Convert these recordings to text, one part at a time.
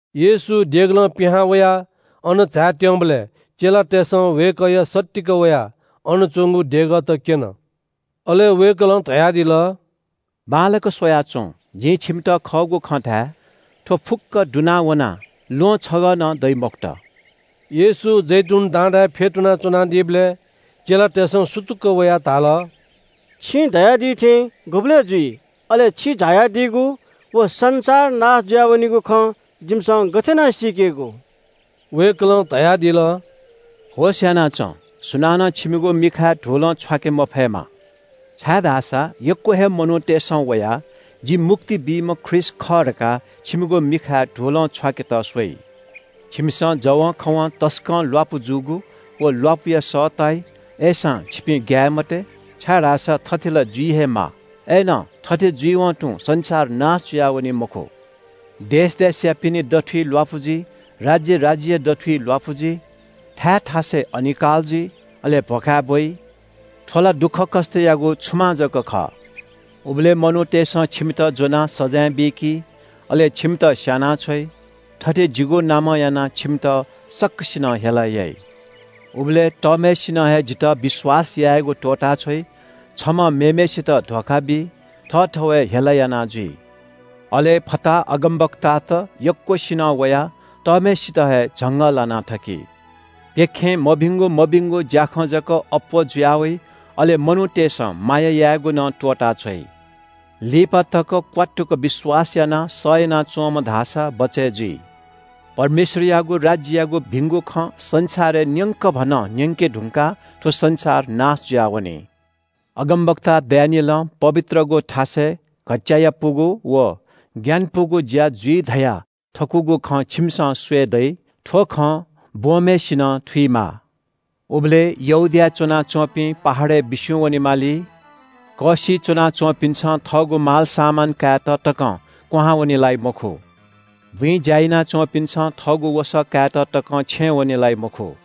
येशू देगलं पिहां वयाः अनं झायेत्‍यंबलय् चेलातय्‌सं वय्‌कःया सत्तीक वयाः अन च्‍वंगु देगःत क्‍यन। अले वय्‌कलं धयादिल – “बांलाक स्‍वयाच्‍वँ। जिं छिमित खःगु खँ धाये – थ्‍व फुक्‍क दुना वनाः ल्‍वहं छगः नं दइ मखुत।” येशू जैतून डाँडाय् फ्‍यतुना च्‍वनादीबलय् चेलातय्‌सं सुतुक्‍क वयाः धाल – “छिं धयादी थें गुबलय् जुइ? अले छि झायादीगु व संसार नाश जुया वनीगु खँ जिमिसं गथे याना सीकेगु?” वय्‌कलं धयादिल – “होश‍यानाच्‍वँ, सुनानं छिमिगु मिखाय् धुलं छ्वाके मफयेमा। छाय्‌धाःसा यक्‍व हे मनूतय्‌सं वयाः – ‘जि मुक्ति बीम्‍ह ख्रीष्‍ट खः’ धकाः छिमिगु मिखाय् धुलं छ्वाकेत स्‍वइ। छिमिसं जवंखवं तसकं ल्‍वापु जूगु व ल्‍वापुया सः ताइ। अय्‌सां छिपिं ग्‍याये मते, छाय्‌धाःसा थथे ला जुइ हे माः। अय्‌नं थथे जुइवं तुं संसार नाश जुयावनी मखु। देश देशयापिनि दथुइ ल्‍वापु जुइ। राज्‍य राज्‍यया दथुइ ल्‍वापु जुइ। थाय् थासय् अनिकाल जुइ, अले भ्‍वखाय् ब्‍वइ। थ्‍व ला दुःखकष्‍टयागु छुमां जक खः।” “उबलय् मनूतय्‌सं छिमित ज्‍वनाः सजाँय बीकी, अले छिमित स्‍यानाछ्वइ। थथे जिगु नामं यानाः छिमित सकसिनं हेला याइ। उबलय् तःम्‍हय्‌सिनं हे जितः विश्‍वास यायेगु त्‍वःताछ्वइ। छम्‍हं मेम्‍हय्‌सित धोखा बी, थःथवय् हेला याना जुइ। अले फताहा अगमवक्तात यक्‍वसिनं वयाः तःम्‍हय्‌सित हे झंगःलाना थकी। प्‍यखें मभिंगु मभिंगु ज्‍याखँ जक अप्‍वः जुया वइ, अले मनूतय्‌सं माया यायेगु नं त्‍वःताछ्वइ। लिपा तक क्‍वात्तुक विश्‍वास यानाः सह यानाच्‍वंम्‍ह धाःसा बचय् जुइ। परमेश्‍वरयागु राज्‍ययागु भिंगु खँ संसारय् न्‍यंकभनं न्‍यंके धुंकाः थ्‍व संसार नाश जुयावनी।” “अगमवक्ता दानिएलं पवित्रगु थासय् घच्‍चायापुगु व ग्‍यानापुगु ज्‍या जुइ धयाथकूगु खँ छिमिसं स्‍वये दइ।” (थ्‍व खँ ब्‍वंम्‍हय्‌सिनं थुइमा) “उबलय् यहूदियाय् च्‍वनाच्‍वंपिं पहाडय् बिस्‍युं वनेमाली। कःसिइ च्‍वनाच्‍वंपिन्‍सं थःगु मालसामान कायेत तकं क्‍वहां वने लाइ मखु। बुँइ ज्‍या याना च्‍वंपिन्‍सं थःगु वसः कायेत तकं छेँ वने लाइ मखु।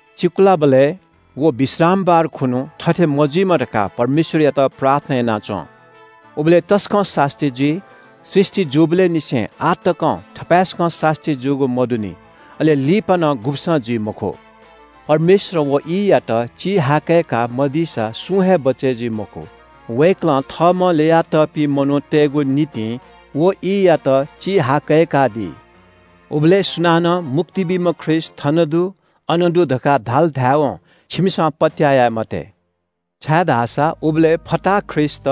चिकुलाबलय् व विश्रामबार खुन्‍हु थथे मजुइमा धकाः परमेश्‍वरयात प्रार्थना याना च्‍वँ। उबलय् तसकं सास्‍ती जुइ। सृष्‍टि जूबलय् निसें आः तकं थपाय्‌सकं सास्‍ती जूगु मदुनि। अले लिपा नं गुब्‍सं जुइ मखु। परमेश्‍वरं व ईयात चिहाकय्‌का मदीसा सुं हे बचय् जुइ मखु। वय्‌कलं थःम्‍हं ल्‍ययातःपिं मनूतय्‌गु निंतिं व ईयात चिहाकय्‌कादी।” “उबलय् सुनानं ‘मुक्ति बीम्‍ह ख्रीष्‍ट थन दु, अन दु’ धकाः धाल धायेवं छिमिसं पत्‍याः याये मते। छाय्‌धाःसा उबलय् फताहा ख्रीष्‍टत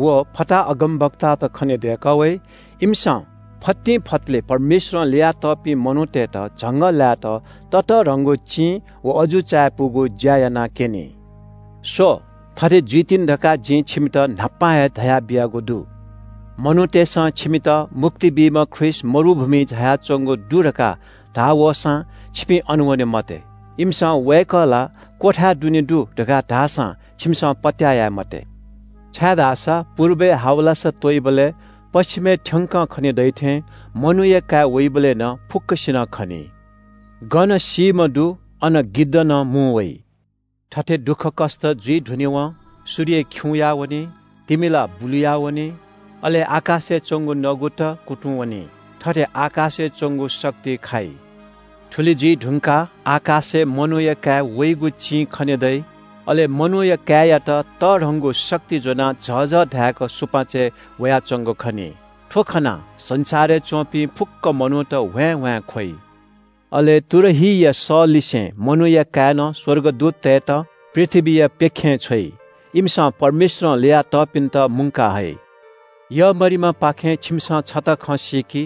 व फताहा अगमवक्तात खनेदय्‌कः वइ। इमिसं फतिंफतले परमेश्‍वरं ल्‍ययातःपिं मनूतय्‌त झंगःलायेत ततःधंगु चिं व अजू चायापुगु ज्‍या यानाक्‍यनी। स्‍व, थथे जुइतिनि धकाः जिं छिमित न्‍हापां हे धयाबियागु दु।” “मनूतय्‌सं छिमित ‘मुक्ति बीम्‍ह ख्रीष्‍ट मरुभूमिइ झायाच्‍वंगु दु’ धकाः धाः वःसां छिपिं अन वने मते। इमिसं ‘वय्‌कः ला क्‍वथाय् दुने दु’ धकाः धाःसां छिमिसं पत्‍याः याये मते। छाय्‌धाःसा पुर्बय् हावलासा त्‍वइबलय् पच्‍छिमय् थ्‍यंक खने दइ थें मनूया काय् वइबलय् नं फुक्‍कसिनं खनी। गन सीम्‍ह दु अन गिद्ध नं मुं वइ।” “थथे दुःखकष्‍ट जुइ धुनेवं “‘सूर्य खिउँया वनी, तिमिला बुलुयावनी, अले आकाशय् च्‍वंगु नगुत कुतुं वनी, थथे आकाशय् च्‍वंगु शक्ति खाइ।’ “थुलि जुइ धुंकाः आकाशय् मनूया काय् वइगु चिं खने दइ। अले मनूया काय्‌यात तःधंगु शक्ति ज्‍वनाः झःझः धाय्‌क सुपाँचय् वयाच्‍वंगु खनी। थ्‍व खनाः संसारय् च्‍वंपिं फुक्‍क कुलयापिं मनूत ह्वाँय्‌ह्वाँय् ख्‍वइ। अले तुरहीया सःलिसें मनूया काय्‌नं स्‍वर्गदूततय्‌त पृथ्‍वीया प्‍यखें छ्वइ। इमिसं परमेश्‍वरं ल्‍ययातःपिन्‍त मुंका हइ। “यःमरिमापाखें छिमिसं छता खँ सीकि।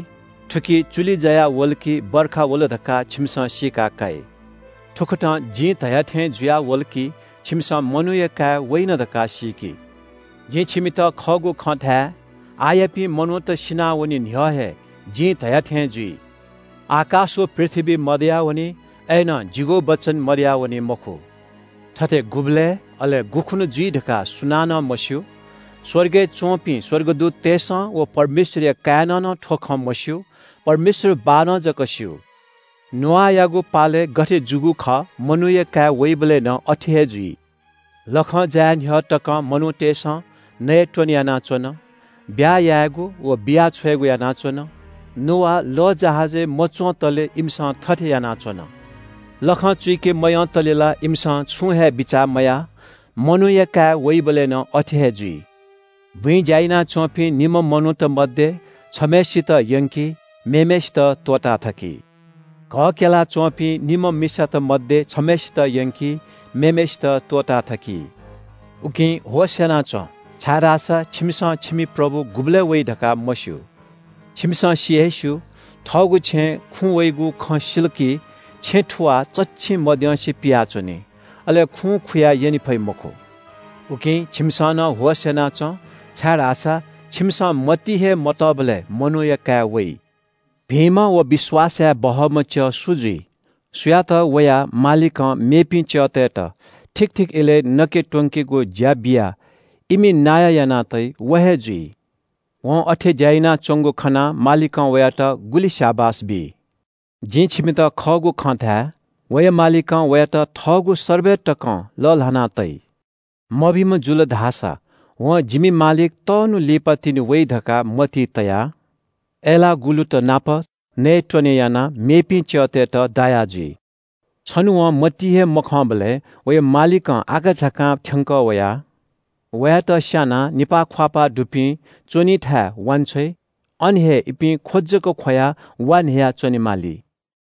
थुकी चुलि जायावल कि वर्षा वल धकाः छिमिसं सीका काइ। थुकथं जिं धया थें जुयावल कि छिमिसं मनूया काय् वइन धकाः सीकि। जिं छिमित खःगु खँ धाये – आःयापिं मनूत सिनावने न्‍ह्यः हे जिं धया थें जुइ। आकाश व पृथ्‍वी मदयावनी, अय्‌नं जिगु वचन मदयावनी मखु। “थथे गुबलय्, अले गुखुन्‍हु जुइ धकाः सुनानं मस्‍यू। स्‍वर्गय् च्‍वंपिं स्‍वर्गदूततय्‌सं व परमेश्‍वरया काय्‌नं नं थ्‍व खँ मस्‍यू। परमेश्‍वर बाःनं जक स्‍यू। “नोआयागु पालय् गथे जूगु खः मनूया काय् वइबलय् नं अथे हे जुइ। लखं जाये न्‍ह्यः तकं मनूतय्‌सं नयेत्‍वने यानाच्‍वन, ब्‍याहा यायेगु व बिया छ्वयेगु यानाच्‍वन। नोआ लःजहाजय् मच्‍वंतले इमिसं थथे यानाच्‍वन। लखं चुइके मयंतले ला इमिसं छुं हे बिचाः मयाः। मनूया काय् वइबलय् नं अथे हे जुइ। “बुँइ ज्‍या यानाच्‍वंपिं निम्‍ह मनूत मध्‍ये छम्‍हय्‌सित यंकी, मेम्‍हय्‌सित त्‍वःताथकी। घः क्‍यला च्‍वंपिं निम्‍ह मिसात मध्‍ये छम्‍हय्‌सित यंकी, मेम्‍हय्‌सित त्‍वःताथकी। “उकिं होश‍यानाच्‍वँ, छाय्‌धाःसा छिमिसं छिमि प्रभु गुबलय् वइ धकाः मस्‍यू। छिमिसं सि हे स्‍यू – थःगु छेँय् खुँ वइगु खँ सिल कि छेँ थुवाः चच्‍छिं मद्यंसे पियाच्‍वनी। अले खुं खुया यने फइ मखु। उकिं छिमिसं नं होश‍यानाच्‍वँ, छाय्‌धाःसा छिमिसं मतिइ हे मतःबलय् मनूया काय् वइ। “भिंम्‍ह व विश्‍वास याये बहःम्‍ह च्‍यः सु जुइ? सुयात वया मालिकं मेपिं च्‍यःतय्‌त ठीक ठीक इलय् नके त्‍वंकेगु ज्‍या बियाः इमि नायः याना तइ, व हे जुइ। वं अथे ज्‍या यानाच्‍वंगु खनाः मालिकं वयात गुलि स्‍याबास बी। जिं छिमित खःगु खँ धाये – वया मालिकं वयात थःगु सर्बय तकं लःल्‍हाना तइ। मभिंम्‍ह जुल धाःसा वं – ‘जिमि मालिक तःन्‍हु लिपातिनि वइ’ धकाः मतिइ तयाः अय्‌लाःगुलुत नाप नयेत्‍वने यानाः मेपिं च्‍यःतय्‌त दाया जुइ। छन्‍हु वं मतिइ हे मखंबलय् वया मालिकं आकाझाकां थ्‍यंकः वयाः वयात स्‍यानाः निपाः ख्‍वाःपाः दुपिं च्‍वनी थाय् वांछ्वइ। अन हे इपिं ख्‍व जक ख्‍वयाः वा न्‍ह्ययाः च्‍वनेमाली।